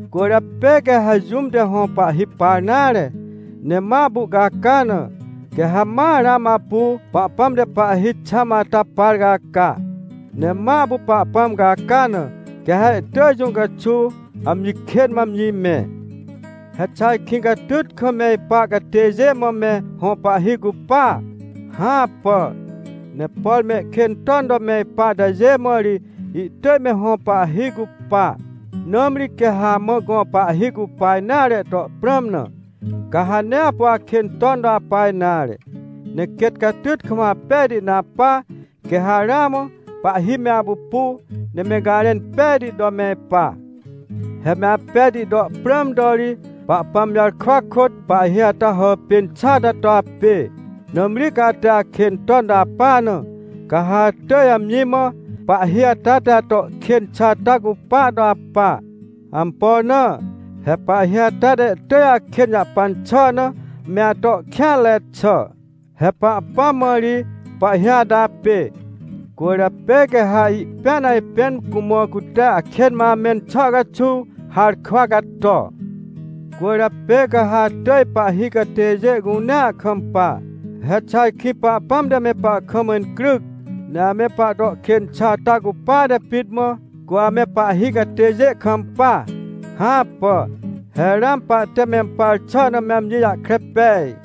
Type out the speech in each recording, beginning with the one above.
Cwỳrjapê quê ha jũm te hõ pahhi par nare, ne ma apu ihcaca na, quê ha ma ramã apu Pahpãm te pahhi xãm ata par caca, ne ma apu Pahpãm caca na, quê ha ihtỳj jũ caxuw amji kên mã amji mẽ. He xà ajkĩ catyt kam me ipa catêjê mã me hõ pahhi cupa? Hãpà! Ne por mehkên ton to me ipa atajê mã ri ihtỳj me hõ pahhi cupa. Nãmri quê ha amã gõ pahhi cupa nare to prãm na, ca ha nee apu akên ton to apa nare, ne quêt catyt kam apejti na apa. Quê ha ramã pahhi me apupu, ne me garẽn pejti to me ipa. He me apejti to prãm to ri, Pahpãm jarkwa kôt pahhi ata hàpên xà ata to apê. Nãmri ca ate akên ton to apa na, ca ha atỳj amji mã pahhi ata te ato kên xà ata cupa to apa. Ampo na? He pahhi ata te ihtỳj akên jahpan xà na me ato kêanre xà. He Pahpãm mã ri pahhi ata apê, cwỳrjapê quê ha ihpĩan ajpên cumã cute akên mã amẽn xà caxuw harkwa cato. Cwỳrjapê ca ha atỳj pahhi catêjê cunea kampa. He xà ajkĩ Pahpãm te me pahkam incryc, ne ame pahto kên xà ata cupate pit mã, cu ame pahhi catêjê kampa? Hãpà. He ramã pahte mempar xà na me amji jahkre pej.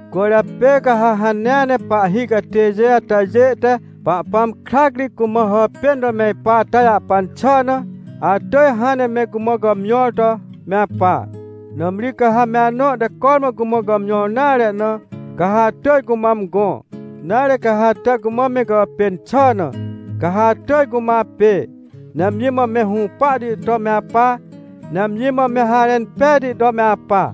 Cwỳrjapê ca ha hanea ne pahhi catêjê atajê te Pahpãm krac ri cumã hàpên to me ipa ata jahpan xà na, atỳj hãn ne me cumã gàmjõr to me apa. Nãmri ca ha me anõ te cormã cumã gàmjõr nare na, ca ha atỳj cumã amgõ. Nare, ca ha ate cumã me gàpên xà na, ca ha atỳj cumã apê. Ne amji mã me hũpahti to me apa, ne amji mã me harẽn pejti to me apa.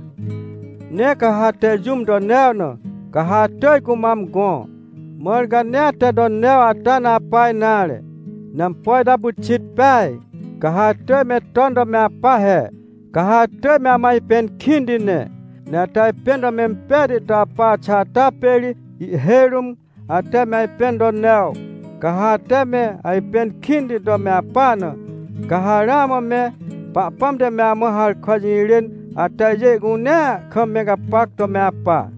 Ne ca ha ate jũm to new na, ca ha atỳj cumã amgõ, mãr ca nee ate to new ata na apa nare. Ne ampo ita pyxit peaj, ca ha atỳj me ton to me apa he. Ca ha atỳj me amã ajpẽn kĩnti ne. Ne ate ajpẽn to mempejti to apa xà ata pê ri ihhêj rũm ate me ajpẽn to new. Ca ha ate me ajpẽn kĩnti to me apa na, ca ha ramã me Pahpãm te me amã harkwa jirên atajê cunea kam me gapac to me apa.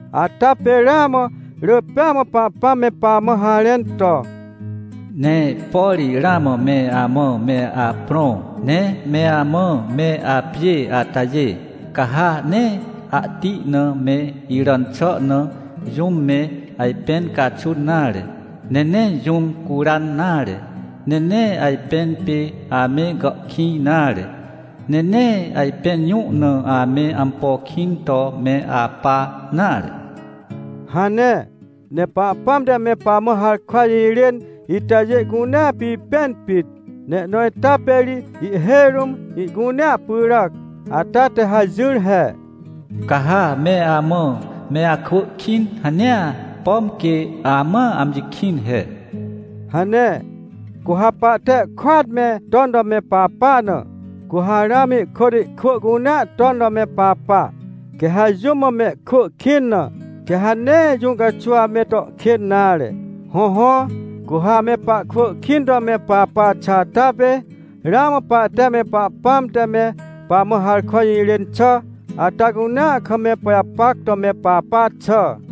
Ata pê ramã rỳ pêa mã Pahpãm me pamã harẽn to: “Ne por ramã me amã me aprõ, ne me amã me apjê atajê, ca ha nee ahti na me iràn xà na, jũm me ajpẽn caxun nare. Ne nee jũm curan nare. Ne nee ajpẽn pê ame gàhkĩj nare. Ne nee ajpẽn jũ na ame ampo kĩn to me apa nare” hane. Ne Pahpãm te me pamã harkwa jirên itajê cunea pipẽn pit. Ne ihnõ ita pê ri ihhêj rũm ihcunea pyràc, ata te hajỹr he: “Ca ha me amã me akwỳ kĩn hanea, pom quê amãa amji kĩn he” hane. Cu ha pahte ihkôat me ton to me papa na, cu ha ramã ihkôt ihkwỳ cunea ton to me papa. Quê ha jũm mã mehkwỳ kĩn na, quê ha nee jũ caxuw ame to kên nare. Hõhõ, cu ha ame pahkwỳ kĩn to me papa xà ata pê, ramã pahte me Pahpãm te me pamã harkwa jirên xà ata cunea kam me pajapac to me papa xà.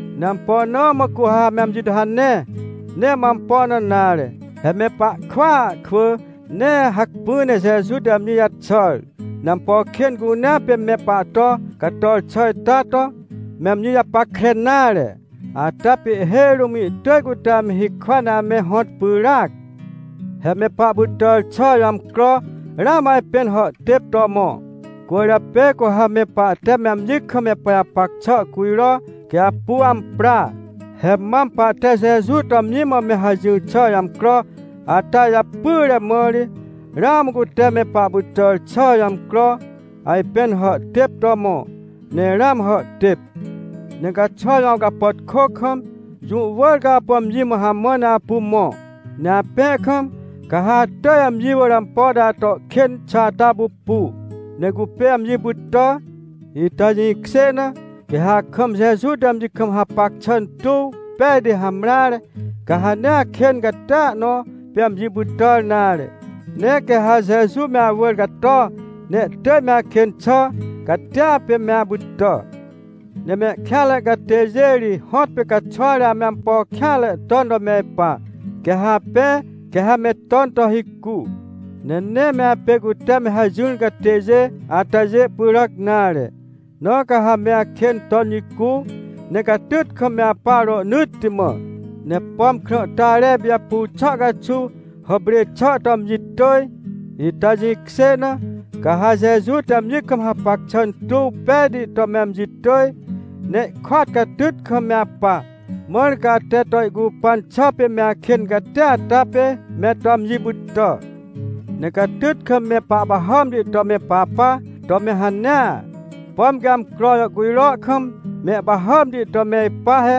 Ne ampo na mã cu ha ame amji to hane? Nee mã ampo na nare. He me pahkwỳa kwỳ, nee hacpỹ ne Jeju te amji jaxàr, ne ampo kên cunea pê me pahto cator xà ita to, me amji japackre nare, ata pê ihhêj rũm ihtỳj cute ame hikwa ne ame hõt pyràac. He me pahpytàr xà jõ amcro ramã ajpên hàhtêp to mõ, cwỳrjapê cu ha me pahte me amji kam me pajapac xà cujrõ, quê apu ampra. He maam pahte Jeju to amji mã me hajỹr xà jõ amcro ata japyre mã ri, ramã cute me pahpytàr xà jõ amcro ajpên hàhtêp to mõ, ne ramã hàhtêp. Ne caxwa jõ awcapàtkô kam, jũ wỳr ca apu amji mã hamã ne apu mõ. Ne apẽ kam, ca ha atỳj amji wỳr ampo te ato kên xà ata pupu, ne cupê amji pytà. Ita jĩkjê na, quê ha akam Jeju te amji kam hapac xà tuw pejti hamreare, ca ha nee akên catia nõ pê amji pytàr nare. Ne quê ha Jeju me awỳr cato, ne ihtỳj me akên xà catia pê me apytà. Ne mehkêanre catêjê ri hõtpê caxwa ri ame ampo kêanre ton to me ipa, quê ha apẽ, quê ha me ton to hicu. Ne nee me apê cute me hajỹr catêjê atajê pyràc nare, na ca ha me akên ton jicu, ne catyt kam me apa rohnỳtti mã. Ne pom krãhtare ipijapu xà caxuw hàprê xà to amji tỳj, ita jĩkjê na, ca ha Jeju te amji kam hapac xà tuw pejti to me amji tỳj, ne ihkôat catyt kam me apa. Mãr ca ate to ihcupan xà pê me akên catia ata pê me to amji pytà. Ne catyt kam me pahpahàmti to me papa to me hanea, pom quê amcro jàhcujro kam mehpahàmti to me ipa he.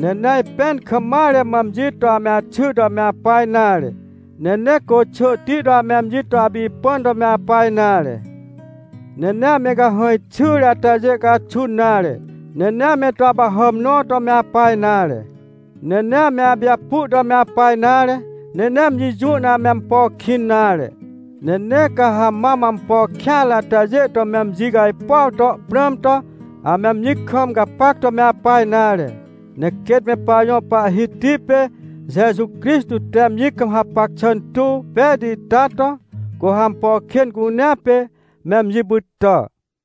Ne nee ajpẽn kam mare mã amji to ame axy to me apa nare. Ne nee côxỳhti to ame amji to apipãn to me apa nare. Ne nee ame cahãj xyre atajê caxun nare, ne nee ame to apahàm nõ to me apa nare. Ne nee ame apijapu to me apa nare. Ne nee amji jũ na ame ampo kĩn nare. Ne nee ca ha mam ampo kêanre atajê to me amji cajpuaw to prãm to, ame amji kam gapac to me apa nare. Ne quêt me pajõ Pahhiti pê Jeju Crixtô te amji kam hapac xà tuw pejti ita to, cu ha ampo kên cunea pê me amji pytà.